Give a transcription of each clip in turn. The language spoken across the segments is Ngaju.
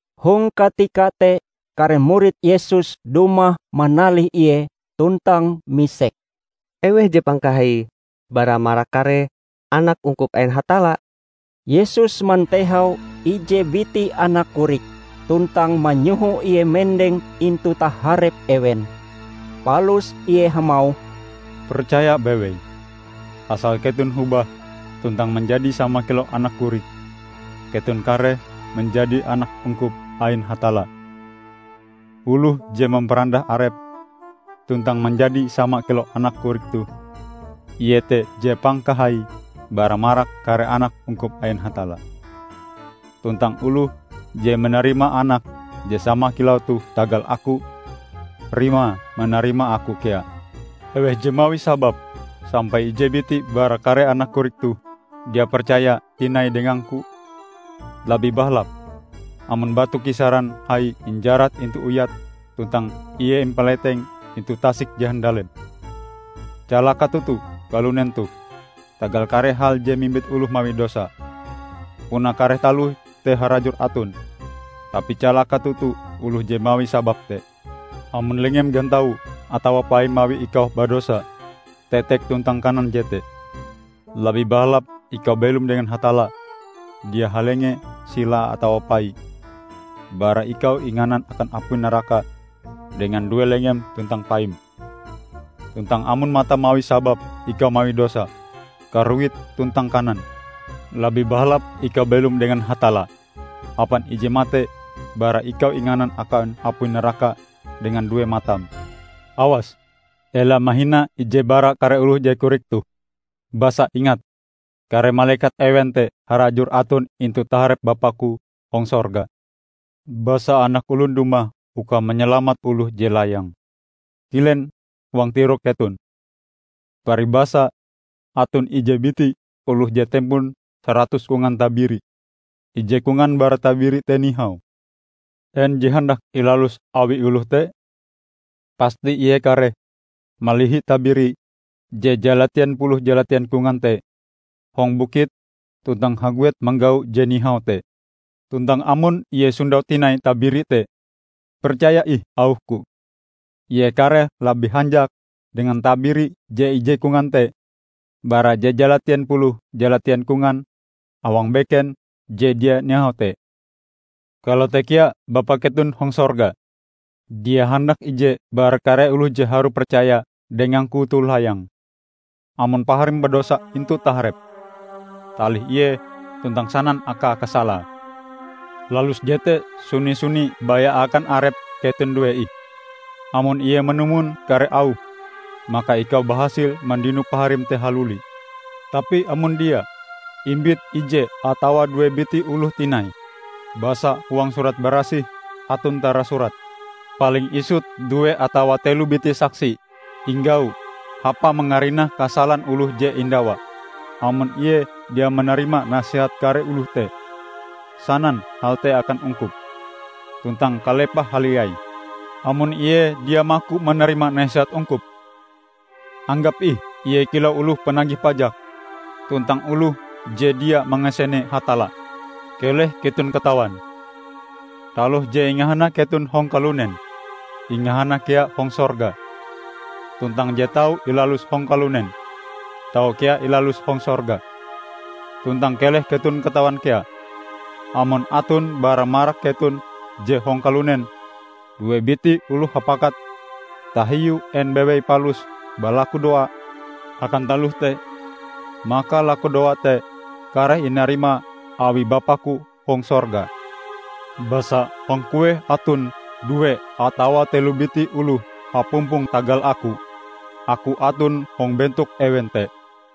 Hong katika te kare murid Yesus dumah manalih Ie tuntang misek, "Eweh je pangkahaie bara marak kare anak ungkup ain Hatalla?" Yesus mantehau ije biti anak korik, tuntang manyoho ie mendeng intu taharep ewen. Palus Ie hamauh, "Percaya bewei! Asal keton hobah tuntang manjadi sama kilau anak korik, keton kareh manjadi anak ungkup ain Hatalla. Oloh je mamparandah arepe tuntang manjadi sama kilau anak korik toh, ie te je pangkahaie bara marak kare anak ungkup ain Hatalla. Tuntang oloh je manarima anak je sama kilau toh tagal Aku, rimae manarima Aku kea." "Eweh je mawi sabab sampai ije biti bara kare anak korik toh dia percaya tinai dengang-Ku, labih bahalap amon batu kisaran hai injarat intu uyate tuntang ie impaleteng intu tasik je handalem. Calaka toto kalunen toh tagal kare hal je mimbit oloh mawi dosa. Puna kare taloh te harajur aton, tapi calaka toto oloh je mawi sabab te! Amon lenge gantaum atawa paim mawi ikau badosa, tetek tuntang kanan jete. Labih bahalap ikau belom dengan Hatalla dia halenge sila atawa pai, bara ikau inganan akan apui naraka dengan due lengem tuntang paim. Tuntang amon matam mawi sabab ikau mawi dosa, karuit tuntang kanan. Labih bahalap ikau belom dengan Hatalla hapan ije mate bara ikau inganan akan apui naraka dengan due matam." "Awas! Ela mahina ije bara kare oloh je korik toh. Basa ingat, kare malekat ewen te harajur aton intu taharep Bapa-Ku hong sorga. [ Basa Anak Olon dumah uka manyalamat oloh je layang!] Kilen huang tirok keton! Paribasae aton ije biti oloh je tempon saratus kongan tabiri, ije kongan bara tabiri te nihau, en je handak ilalus awi oloh te? Pasti ie kareh malihi tabiri je jalatien puluh jalatien kongan te hong bukit tuntang haguet manggau je nihau te. Tuntang amon ie sondau tinai tabiri te, percaya ih auh-Ku -- ie kareh labih hanjak dengan tabiri je ije kongan te bara je jalatien puluh jalatien kongan awang beken je dia nihau te. Kalote kea Bapa keton hong sorga dia handak ije bara kare oloh je harue percaya dengang-Ku toh layang." "Amon paharim badosa intu taharepm, talih ie tuntang sanan akae kasalae. Lalus jete suni-suni baya akan arep keton due ih. Amon ie manumon kare auhm, maka ikau bahasil mandino paharim te haluli. Tapi amon dia, imbit ije atawa due biti oloh tinai. Basa huang Surat Barasih aton tarasurat, 'Paling isut due atawa telo biti saksi inggau hapa mangarinah kasalan oloh je indawa.' Amon ie dia manarima nasehat kare oloh te, sanan hal te akan ungkup. Tuntang kalepahe haliai, amon ie dia maku manarima nasehat ungkup, anggap ih ie kilau oloh panagih pajak tuntang oloh je dia mangasene Hatalla." "Keleh keton katawan: Taloh je ingahana keton hong kalunen, ingahana kea hong sorga. Tuntang je tau ilalus hong kalunen, tau kea ilalus hong sorga. Tuntang keleh keton katawan kea: Amon aton bara marak keton je hong kalunen due biti oloh hapakat tahiu en bewei palus balakudoa akan taloh te, maka lakudoae te kareh inarima awi Bapa-Ku hong sorga. Basa hong kueh aton due atawa telo biti oloh hapumpong tagal Aku, Aku aton hong bentok ewen te."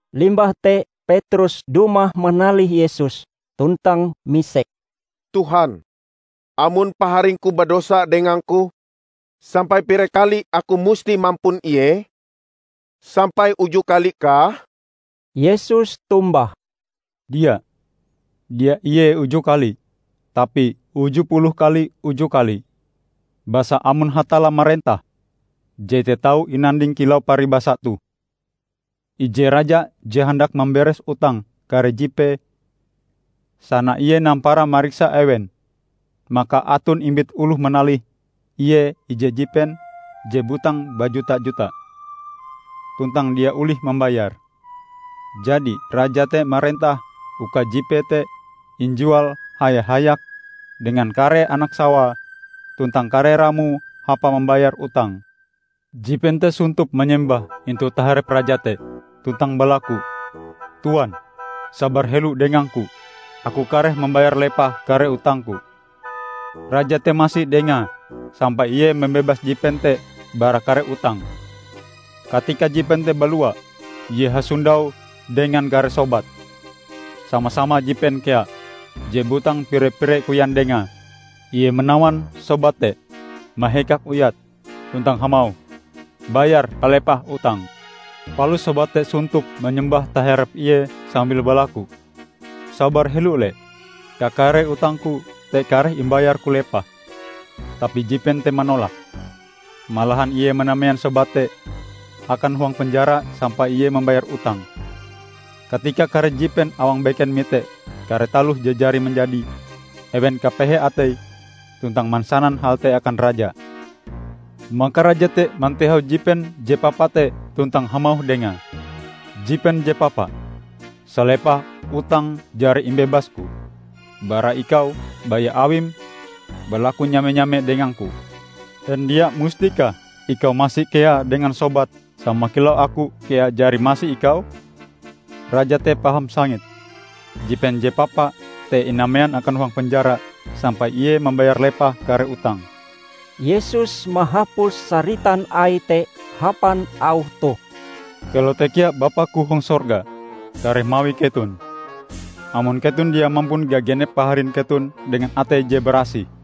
Limbah te Petrus dumah manalih Yesus tuntang misek, "Tuhan, amon paharingku badosa dengangku, sampai pire kali aku musti mampun ie? Sampai uju kali kah?" Yesus tombah, "Dia, dia ie uju kali, tapi uju puluh kali uju kali! Basa amon Hatalla marentah, jete tau inanding kilau paribasa toh: Ije raja je handak mamberes utang kare jipee. Sana ie nampara mariksa ewen, maka aton imbit oloh manalih ie ije jipen je butang bajuta-juta, tuntang dia olihe mambayare. Jadi, raja te marentah uka jipee te injual haya-hayak dengan kare anak-sawae tuntang kare ramoe hapa mambayar utange. Jipen te sontop manyembah intu taharep raja te, tuntang balaku, 'Tuan, sabar helo dengangku. Aku kareh mambayar lepah kare utangku.' Raja te masi dengae sampai ie mambebas jipen te bara kare utange. Katika jipen te balua, ie hasondau dengan kare sobate, sama-sama jipen kea, je butang pire-pire koyan dengae. Ie manawan sobate te, mahekak uyate, tuntang hamauh, 'Bayar palepah utangm!' Palus sobate te sontop manyembah taharep ie sambil balaku, 'Sabar helo le, kakare utangku te kareh imbayarku lepah!' Tapi jipen te manolak. Malahan ie manamean sobate te akan huang penjara sampai ie mambayar utange. Katika kare jipen awang beken mite kare taloh je jari manjadi, ewen kapehe atei tuntang mansanan hal te akan raja. Maka raja te mantehau jipen je papa te tuntang hamauh dengae, 'Jipen je papa! Salepah utangm jari imbebasku bara ikau baya awim balaku nyame-nyame dengangku. En dia mustikah ikau masi kea dengan sobatm sama kilau aku kea jari masi ikau?' Raja te paham sangit. Jipen je papa te inamean akan huang penjara sampai ie mambayar lepah kare utange." Yesus mahapus saritan Aie te hapan auh toh, "Kalote kea Bapa-Ku hong sorga kareh mawi keton, amon keton dia mampun gagenep paharin keton dengan atei je barasih."